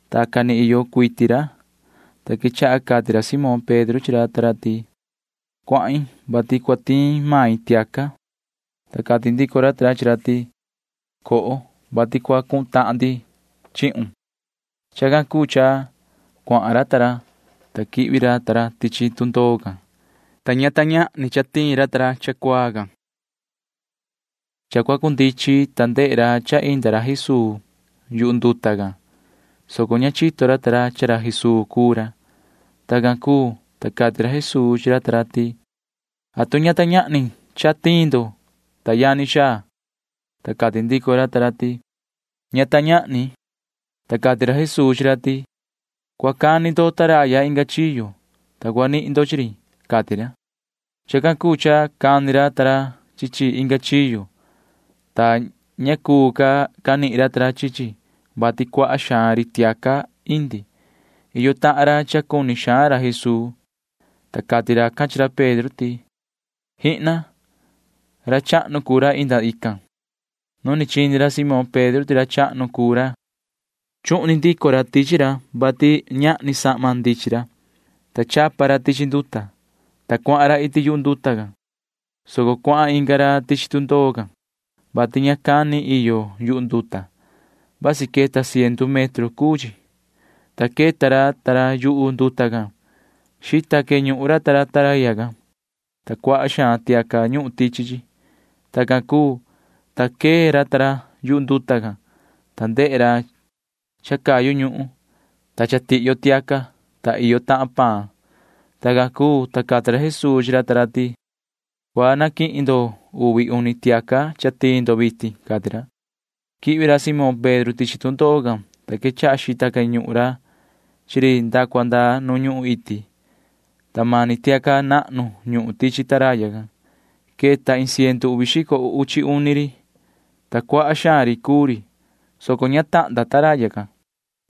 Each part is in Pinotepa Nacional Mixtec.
Tacan ni iyo cuiti ra, ta quechaha cati ra Simón Pedro chi ra ta ra ti: ―Cuahin, vati cua tiin main tiaca. Ta cati ndico ra ta ra chi ra ti: ―Coho, vati cua cuhun tahan ndi chihun. Chacan cuu cha cuahan ra ta ra, ta quihvi ra tichi tundoo, ta ña ta ñahni cha tiin ra cha cuaa can. Cha cua cundichin, ta ndehe ra cha inda Jesuu yu nduta can, soco ña chito ra ta ra ti ra Jesuu cuu ra. Tacan cuu, ta cati ra Jesuu chi ra ta ra ti: ―¿Atu ña ta ñahni cha tiin ndo, ta yani xaa? Ta cati ndico ra ta ra ti: ―Ña ta ñahni. Ta cati ra Jesuu chi ra ti: ―Cua cani ndo taraya inga chiyo, ta cua nihin ndo chi ri ―cati ra. Chacan cuu cha cani ra ta ra chi chi inga chiyo, ta ña cuu ca canihin ra chi chi, vati cuaha xaan ri tiaca indi. Iyo tahan ra cha cuni xaan ra Jesuu, ta cati racan chi ra Pedro ti: ―¡Jihna! Ra chahnu cuu ra cha inda. Nu ni chini ra Simón Pedro ti ra chahnu cuu ra chuhni ndico ra tichi ra, vati ña chanami vaha ra, ta chapa ra tichi nduta, ta cuahan ra iti yu nduta, soco cuahan inga ra tichi tundoo can, vati ña cani iyo yuhu nduta. Vasi queta ciendu metro, ta queta ra ta ra yu nduta can. Xita queñuhun ra taraya can, ta cuaha xaan tiaca ñuhun tichi chi. Tacan cuu, ta queta ra ta ra yu nduta can, ta ndehe ra cha cayu ñuhun, ta cha tihyo tiaca, ta iyo tahan paan. Tacan cuu, ta cati ra Jesuu chi ra ta ra ti: ―Cua naquihin ndo uvi uni tiaca cha tiin ndo vitin ―cati ra. Quihvi ra Simón Pedro tichi tundoo can, ta quechaha xita queñuhun ra chi ri nda cua nda nu ñuhun iti, ta mani tiaca nahnu ñuhun taraya can. Queta iin ciendu uvi xico uchi uni ri, ta cuaha xaan ri cuu ri, soco ña tahnda taraya can.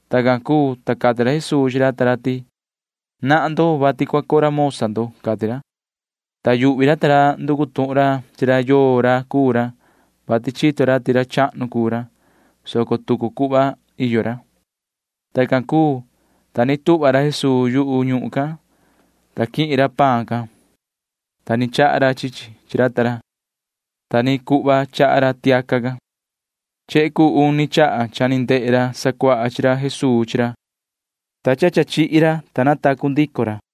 Tacan cuu, ta cati ra Jesuu chi ra ta ra ti: ―Nahan ndo, vati cua curamosa ndo ―cati ra. Ta yuhvi ra ta ra nducu tuhun ra chi ra yoo ra cuu ra, vati chito ra ti ra chahnu cuu ra, [soco tucu cuhva iyo ra]. Tacan cuu, ta ni tuhva ra Jesuu yu nuhun can, ta quihin ra paan can, ta ni chaha ra chi chi chi ra ta ra, ta ta ni cuhva chaha ra tiaca can. Chehe cuu uni chaha cha ni ndehe ra sacuaha chi ra Jesuu chi ra, ta cha ni chihi ra, ta natacu ndico ra.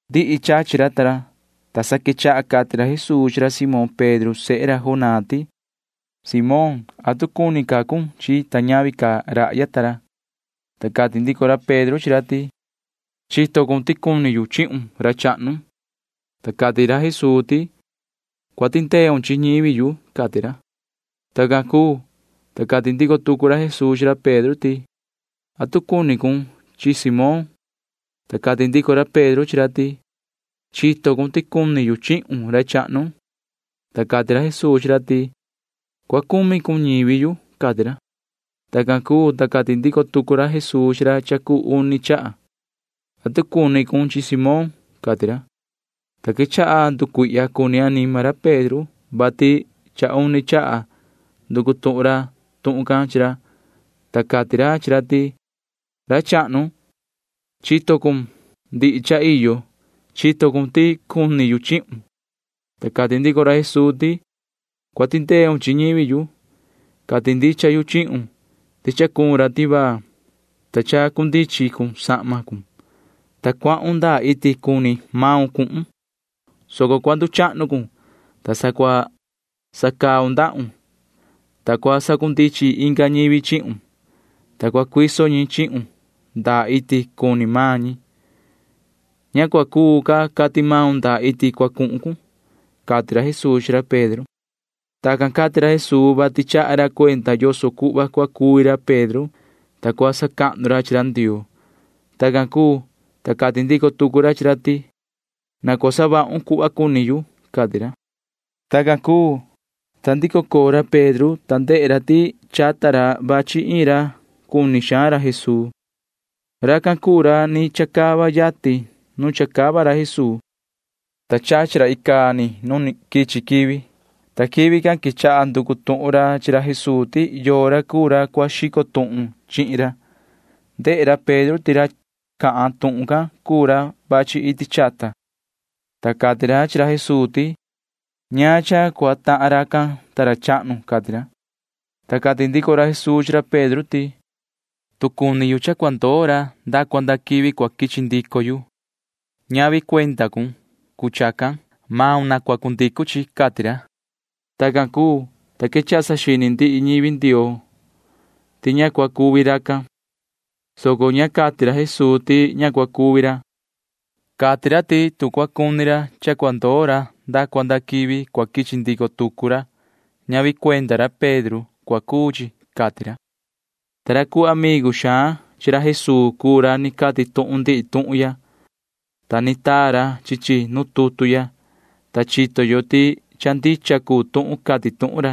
Ndihi chachi ra ta ra, ta sa quechaha cati ra Jesuu chi ra Simón Pedro sehe Jonaa ti: ―Moon, cuni rahya ta ra chihin yu. ¿Atu cuni con chihin yu? Ta cati ndico ra Pedro chi ra ti: ―Chito cun ti cuni yu chihun, ra chahnu. Ta cati ra Jesuu ti: ―Cua tindeun chi ñivi yu ―cati ra. Tacan cuu, ta cati ndico tucu ra Jesuu chi ra Pedro ti: ―¿Atu cuni cun chihin yu, Moon? Ta cati ndico ra Pedro chi ra ti: ―Chito cun ti cuni yu chihun, ra chahnu. Ta cati ra Jesuu chi ra ti: ―Cua cumi cun chi ñivi yu ―cati ra. Tacan cuu, ta cati ndico tucu ra Jesuu chi ra cha cuu uni chaha: ―¿Atu cuni cun chihin yu, Moon? ―cati ra. Ta quechaha cucuihya cuni anima ra Pedro, vati cha uni chaha cha nducu tuhun ra tuhun can chi ra, ta cati ra chi ra ti: ―Ra chahnu, chito cun ndihi cha iyo. Chito cun ti cuni yu chihun. Ta cati ndico ra Jesuu ti: ―Cua tindeun chi ñivi yu. Cati ndicha yu chihun ti cha cuun ra tivaa, ta chacundichin cun sahmon, ta cuahun ndaa iti cuni maun cuhun, soco cua nduchahnu cun, ta sa cua sacaun ndahun, ta cua sacundichin inga ñivi chihun, ta cua cuiso ñi chihun ndaa iti cuni maan ñi. Ña cua cuu ca cati maun ndaa iti cua cuhun cun ―cati ra Jesuu chi ra Pedro. Tacan cati ra Jesuu, vati chaha ra cuenda yoso cuhva cua cuvi ra Pedro, ta cua sacahnu ra chi ra Ndioo. Tacan cuu, ta cati ndico tucu ra chi ra ti: ―Na cua savahun cuhva cuni yu ―cati ra. Tacan cuu, ta ndico coo ra Pedro, ta ndehe ra ti chata ra vachi iin ra, ta cuni xaan ra Jesuu chi ra. Racan cuu ra ni chacava yatin nu chacava ra Jesuu, ta chachi ra icaa ni nu quichi quivi, ta quivi can quechaha nducu tuhun ra chi ra Jesuu ti yoo ra cuu ra cua xico tuhun chihin ra. Ndehe ra Pedro ti ra cahan tuhun can cuu ra vachi iti chata, ta cati ra chi ra Jesuu ti: ―¿Ñaan cha cua tahan racan, ta ra chahnu? ―cati ra. Ta cati ndico ra Jesuu chi ra Pedro ti: ―Tu cua cuni yu cha cua ndoo ra nda cua nda quivi cua quichi ndico yu, ñavi cuenda maun cua cuu chi. Maun na cua savahun cuhva cuni yu ―cati ra. Tacan cuu, ta quechaha saxini ndihi ñivi Ndioo ti ña cua cuvi racan, soco ña cati ra Jesuu ti ña cua cuvi ra. Cati ra ti tu cua cuni ra cha cua ndoo ra nda cua nda quivi cua quichi ndico tucu ra, ñavi cuenda ra Pedro cua cuu chi, cati ra. Ta ra cuu amigu xaan chi ra Jesuu cuu ra ni cati tuhun ndihi tuhun ya, ta ni taa ra chi chi nu tutu ya, ta chito yo ti cha ndicha cuu tuhun cati tuhun ra.